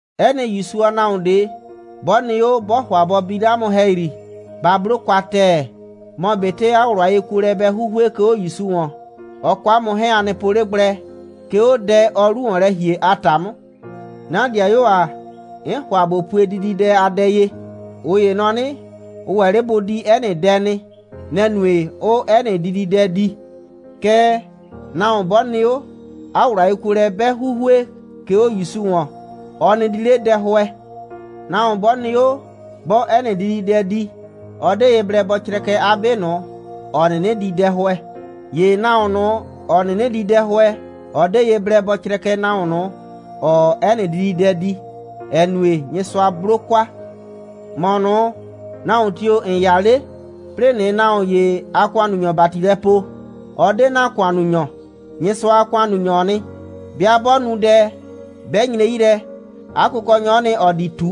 'Ɛ nɩ ‑Yusu a nahuon ꞊de, 'bɔ nɩ 'o, 'bɔɔ ‑hʋa bɔ bi 'le 'a mʋ ‑hɛyri, ba 'blo kwa ‑tɛɛ, mɔ ꞊betɩ 'a ꞊wlʋ a yekuolɛ bɛ 'huhue, 'ke 'o ‑Yusu ‑wɔn. Ɔ kɔ 'a mʋ 'hɛɛn, a nɩ po 'le gblɛ, 'ke 'o dɛ, ɔɔ 'lu ‑wɔn lɛ ‑hie a ‑ta 'mʋ. 'Na ‑dɩayuo ‑a, 'n ‑hʋa ꞊bo pue dididɛ a dɛ ye. ꞊Ʋ ‑ye nɔ 'nɩ, ʋ ‑wɛ 'le bʋ di 'ɛ nɩ dɛ nɩ. Nɛ‑ nue, 'ʋʋ 'ɛ nɩ dididɛ di. Kɛɛ, nahuon 'bɔ nɩ 'o, 'a ꞊wlʋ a yekuolɛ 'bɛ 'huhue, 'ke 'o ‑Yusu ‑wɔn, ɔ 'nɩ di ꞊le dɛhʋɛ. Nahuon 'bɔ nɩ 'o, 'bɔɔ 'ɛ nɩ dididɛ di, ɔ 'de ye blɛ bɔ crɛkɛ 'a 'be ꞊nʋ, ‑ɔ 'nɩnɩ di dɛhʋɛ. ‑Ye nahuon ꞊nʋ, ‑ɔ 'nɩnɩ di dɛhʋɛ, ɔ 'de ye blɛ bɔ crɛkɛ nahuon ꞊nʋ, ‑ɔɔ 'ɛ nɩ dididɛ di, ‑ɛ nue, Nyɩsʋa 'blo kwa. ‑Mɔ ꞊nʋ, nahuon tio‑ ‑n 'ya 'le, 'plɩɩ ꞊nɩɩ nahuon ‑ye a ‑kʋannunyɔ ‑bati lɛ poo. Ɔ 'de ‑na ‑kʋannunyɔ. Nyɩsʋa a ‑kʋannunyɔ'ɔ nɩ. 'Bɩa 'bɔ nu dɛ, 'bɛ nyre 'yi lɛ, 'a kʋkɔnyɔ'ɔ nɩ, ‑ɔ di ꞊tu.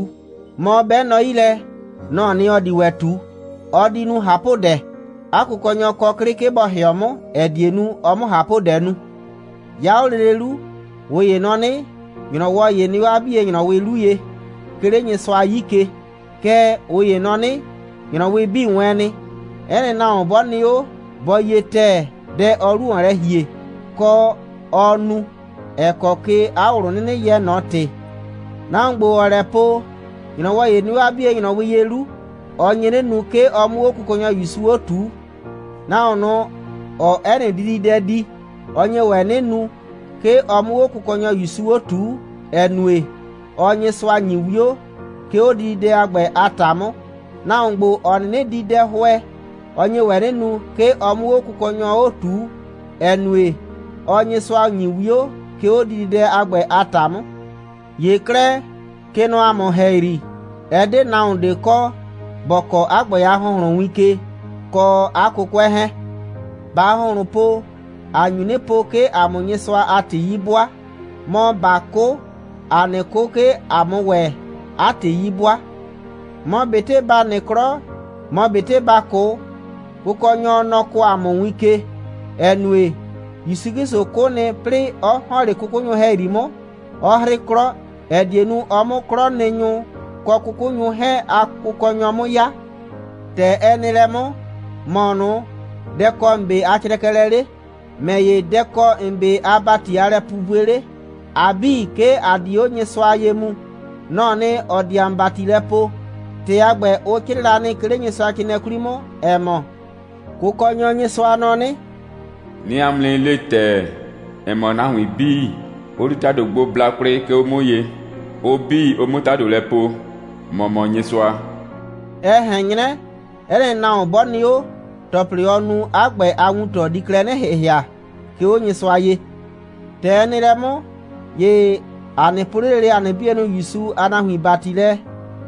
Mɔ, 'bɛ nɔ 'yi lɛ, nɔ‑ɔ nɩ, ‑ɔ di ‑wɛ ꞊tu. Ɔ di nu ꞊hapʋdɛ. 'A kʋkɔnyɔ kɔ 'klɩ, 'ke bɔ ‑hɩɔ 'mʋ, ‑ɛ die nu, ɔ 'mʋ ꞊hapʋdɛ nu. 'Ya 'o lele 'lu, ꞊ʋ ‑ye nɔ 'nɩ, ‑nyrɔwɔ ‑ye nɩ 'o 'a 'bie ‑nyrɔwɩ 'lu ye, 'ke 'le Nyɩsʋa 'yi ke. Kɛɛ, ꞊ʋ ‑ye nɔ 'nɩ, ‑nyrɔwɩ 'bii wɛɛn nɩ. 'Ɛ nɩ nahuon 'bɔ nɩ 'o, bɔ yie ‑tɛɛ, dɛ, ɔɔ 'lu ‑wɔn lɛ ‑hie, kɔ, ɔɔ nu, ‑ɛ kɔ ke 'a ꞊wlʋ 'nɩnɩ yɛɛ ꞊nɔ ‑tɩ. Nahuon ‑gbo, ‑ɔɔ lɛ po, ‑nyrɔwɔ ‑ye nɩ 'o 'a 'bie ‑nyrɔwɩ ye 'lu, ɔ nye 'nɩ nu, 'ke ɔ 'mʋ 'o Kʋkɔnyɔ ‑Yusu 'o ꞊tuu. Nahuon ꞊nʋ, ‑ɔɔ 'ɛ nɩ dididɛ di, ɔ nye ‑wɛ 'nɩ nu, 'ke ɔ 'mʋ 'o Kʋkɔnyɔ ‑Yusu 'o ꞊tuu, ‑ɛ nue, ɔɔ Nyɩsʋa ‑nyi 'wio, 'ke 'o dididɛ a ‑gbɛ a ‑ta 'mʋ. Nahuon ‑gbo, ‑ɔ 'nɩnɩ di dɛhʋɛ, ɔ nye ‑wɛ 'nɩ nu, 'ke ɔ 'mʋ 'o Kʋkɔnyɔ 'o ꞊tuu, ‑ɛ nue, ɔɔ Nyɩsʋa ‑nyi 'wio, 'ke 'o dididɛ a ‑gbɛ a ‑ta 'mʋ. ‑Ye 'klɛɛ, kɛ nɔ ‑a mʋ ‑hɛyri, ɛ 'de nahuon ꞊de kɔ, ‑bɔ kɔɔ 'a ‑gbɛ a ‑hʋnhlʋn win ke, kɔ 'a 'kʋkʋɛ 'hɛɛn. ꞊Baa ‑hʋnhlʋn po, ‑a nyu 'nɩ po, 'ke ‑a 'mʋ Nyɩsʋa a ‑tɩ 'yi 'bʋaa, mɔ, ꞊baa 'kʋ, ‑aa 'nɩ 'kʋ, 'ke ‑a 'mʋ ‑wɛ 'a ‑tɩ 'yi 'bʋaa. Mɔ ꞊betɩ ‑ba nɩ 'klɔ, mɔ ꞊betɩ ‑baa 'kʋ, Kʋkɔnyɔ, nɔ‑ kɔɔ ‑a mʋ win ke, ‑ɛ nue, ‑Yusu 'Klɩsʋ 'kʋ nɩ, 'plɩɩ 'ɔ ‑hɔn 'le 'kʋkʋnyʋ ‑hɛyri 'mʋ, 'ɔ 'hrɩ 'klɔ, ‑ɛ die nu, ɔ 'mʋ 'klɔnɩnyʋ kɔ 'kʋkʋnyʋ 'hɛɛn a Kʋkɔnyɔ 'mʋ 'ya. ‑Tɛ ɛ nɩ lɛ 'mʋ, ‑mɔ ꞊nʋ, dɛ‑ kɔ ‑n 'be a crɛkɛlɛ 'le? ‑Mɛ ‑ye, dɛ‑ kɔ ‑n 'be a ‑bati a lɛpupue 'le? ‑A 'bii, 'ke ‑a di 'o Nyɩsʋa ye mu. Nɔ‑ɔ nɩ, ‑ɔ di ‑a mʋ ‑bati lɛ poo. ‑Tɩ a ‑gbɛ, ʋ 'crɩɩ la nɩ, 'ke 'le Nyɩsʋacrɩɩnɩɛ 'kwli 'mʋ, ‑ɛ mɔ: «Kʋkɔnyɔ Nyɩsʋa nɔ 'nɩ: 'Nɩɩ 'a mʋ 'nɩ le ‑tɛɛ, ‑ɛ mɔ, nahuin 'bii, ʋ di ‑tado gbo bla kwlɩ, 'ke 'o 'mʋ ye, ʋ 'bii, ʋ 'mʋ ‑tado lɛ po: ‑Mɔ mɔ Nyɩsʋa.» Ɛ ꞊hɛn 'nyrɛ, 'ɛ nɩ nahuon 'bɔ nɩ 'o, ‑tɔplɩ, ɔ nu, 'a ‑gbɛ a wuntɔ di klɛ 'nɩ ‑hɩhɩa, 'ke 'o Nyɩsʋa ye. ‑Tɛ ɛ nɩ lɛ 'mʋ, ‑ye ‑a nɩ poo 'le lele ‑a nɩ 'bienʋ ‑Yusu a nahuin ‑bati lɛ,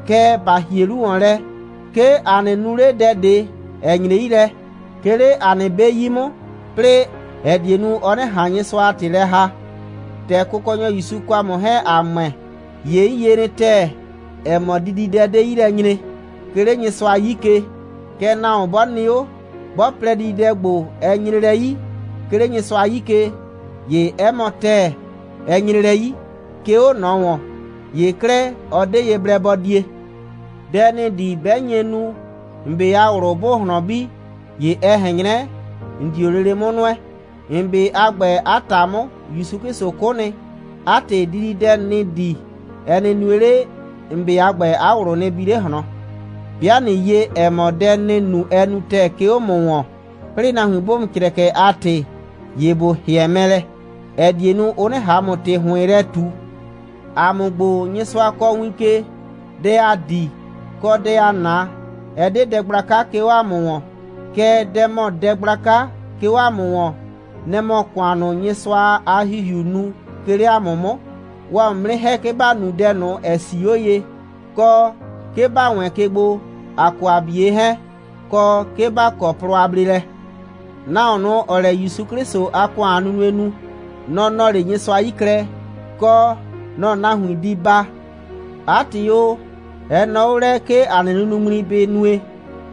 kɛɛ, ‑ba ‑hie 'lu ‑wɔn lɛ, 'ke ‑a nɩ nu 'le dɛ ꞊de, ‑ɛ nyre 'yi lɛ, 'ke 'le ‑a nɩ 'be 'yi 'mʋ, 'plɩɩ ‑ɛ die nu, ɔ 'nɩ ꞊han Nyɩsʋa a ‑tɩ lɛ ‑haa. ‑Tɛ Kʋkɔnyɔ ‑Yusu kɔ 'mʋ 'hɛɛn, ‑a ‑mʋɛ, ‑ye 'n yie nɩ ‑tɛɛ, ‑ɛ mɔ, dididɛ ꞊de 'de 'yi lɛ nyre, 'ke 'le Nyɩsʋa 'yi ke. Kɛɛ, nahuon 'bɔ nɩ 'o, 'bɔ plɛ, dididɛ ‑gbo, ɛ nyre lɛ 'yi, 'ke 'le Nyɩsʋa 'yi ke, ‑ye 'ɛ mɔ ‑tɛɛ, ɛ nyre lɛ 'yi, 'ke 'o ꞊nɔ ‑wɔn. ‑Ye 'klɛɛ, ɔ 'de ye blɛ bɔ die. Dɛ ‑nɩɩ di, 'bɛ nye nu, ‑n 'be a ꞊wlʋ 'bʋʋ ꞊hlɔn bi, ‑ye ɛ ꞊hɛn 'nyrɛ, ‑n 'dio lele 'mʋ nʋɛ. ‑N 'be a ‑gbɛ, 'a ‑ta 'mʋ, ‑Yusu 'Klɩsʋ 'kʋ nɩ. 'A ‑tɩ, dididɛ ‑nɩɩ di, ɛ nɩ nue 'le, ‑n 'be a ‑gbɛ a ꞊wlʋ nɩ bi 'le ꞊hlɔn. 'Bɩa ꞊nɩ yie, ‑ɛ mɔ, dɛ ‑nɩɩ nu, ɛ nu ‑tɛɛ, 'ke 'o ‑mʋ ‑wɔn, 'plɩɩ nahuin 'bʋʋ ‑mʋ crɛkɛ 'a ‑tɩ, ‑ye ‑bo ‑hɩɛ mɛ lɛ, ‑ɛ die nu, ʋ 'nɩ ꞊han ‑mʋ ‑tɩ ‑hʋɩn yrɛ ꞊tu. ‑A mʋ ‑gbo, Nyɩsʋa kɔɔ win ke, dɛ ‑aa di, kɔ, dɛ ‑aa 'na, ɛ 'de dɛ gblaka, 'ke 'o ‑a mʋ ‑wɔn. Kɛɛ, dɛ ‑mɔ dɛ gblaka, 'ke 'o ‑a mʋ ‑wɔn, nɛ‑ mɔ ‑kʋan ꞊nʋ, Nyɩsʋa a ‑Hihiuu nu, 'ke 'le ‑a mʋ 'mʋ. Ʋʋ ‑a mʋ 'mʋ 'nɩ ‑hɛ, 'ke ‑ba nu dɛ ꞊nʋ, ‑ɛ 'sii 'o ye, kɔ, 'ke ‑ba wɛɛn ke gbo, ‑a kɔ ‑a 'bie 'hɛɛn, kɔ, 'ke ‑ba kɔ plɔ a bleelɛ. Nahuon ꞊nʋ, ‑ɔɔ lɛ ‑Yusu 'Klɩsʋ a ‑kʋan a nunue nu, nɔ‑ nɔɔ 'le Nyɩsʋa 'yi klɛ, kɔ, nɔ‑ nahuin di baa. 'A ‑tɩ o, ɛ nɔɔ 'o lɛ, 'ke ‑a nɩ nunuŋmli bɩ nue,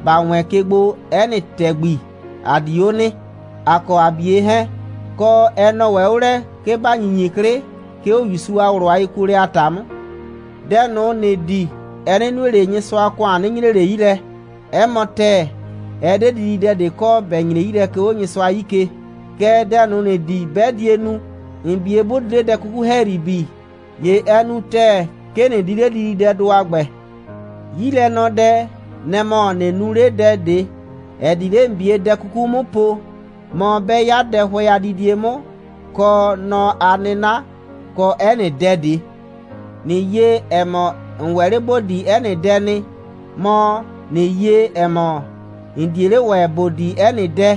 ‑ba wɛɛn ke gbo 'ɛ nɩ ‑tɛgbi, ‑a di 'o nɩ, ‑a kɔ ‑a 'bie 'hɛɛn, kɔ, ɛ nɔɔ ‑wɛ 'o lɛ, 'ke ‑ba ‑nyinyi 'klɩ, 'ke 'o ‑Yusu a ꞊wlʋ a yekuolɛ a ‑ta 'mʋ. Dɛ ꞊nʋ, ‑nɩɩ di, ɛ nɩ nue 'le, Nyɩsʋa a ‑kʋan nɩ nyre 'le 'yi lɛ. 'Ɛ mɔ ‑tɛɛ, ɛ 'de dididɛ ꞊de kɔ, ‑bɛ nyre 'yi lɛ, 'ke 'o Nyɩsʋa 'yi ke, kɛɛ, dɛ ꞊nʋ, ‑nɩɩ di, 'bɛ die nu, ‑n 'bie 'bʋ di 'le dɛ 'kuku ‑hɛyri bi, ‑ye ɛ nu ‑tɛɛ, 'ke ꞊nɩ di 'le dididɛdʋ a ‑gbɛ. 'Yilɛnɔdɛ, nɛ‑ mɔ, ꞊nɩ nu 'le dɛ ꞊de, ‑ɛ di 'le ‑n 'bie dɛ 'kuku 'mʋ po, mɔ, 'bɛ 'ya dɛhʋɛ a didie 'mʋ, kɔ nɔ a 'nɩna, kɔ 'ɛ nɩ dɛ ꞊de. ꞊Nɩ yie, ‑ɛ mɔ, ‑n ‑wɛ 'le ‑bo di 'ɛ nɩ dɛ nɩ, mɔ, ꞊nɩ yie, ‑ɛ mɔ, ‑n 'die 'le ‑wɛ ‑bo di 'ɛ nɩ dɛ,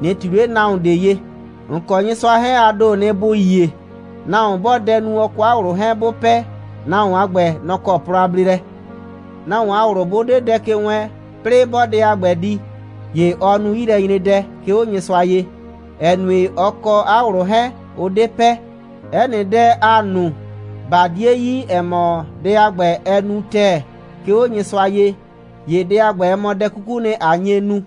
꞊nɩ ꞊tui 'le nahuon ꞊de ye. ‑N kɔ Nyɩsʋa 'hɛɛn, a ‑doo nɩ, ‑bʋ yie. Nahuon 'bɔɔ dɛ nu, ɔ kɔ 'a ꞊wlʋ 'hɛɛn 'bʋ pɛ, nahuon a ‑gbɛ, nɔ‑ kɔ plɔ a bleelɛ. Nahuon a ꞊wlʋ 'bʋ 'de dɛ ke wɛɛn, 'plɩɩ 'bɔɔ dɛ a ‑gbɛ di, ‑ye ɔɔ nu 'yilɛnyredɛ, 'ke 'o Nyɩsʋa ye, ‑ɛ nue, ɔ kɔ 'a ꞊wlʋ 'hɛɛn, ʋ 'de pɛ. 'Ɛ nɩ dɛ, ‑aa nu, ꞊ba 'die yi, ‑ɛ mɔ, dɛ a ‑gbɛ, ɛ nu ‑tɛɛ, 'ke 'o Nyɩsʋa ye, ‑ye dɛ a ‑gbɛ, ɛ mɔ dɛ 'kukuu nɩ, ꞊a nye nu.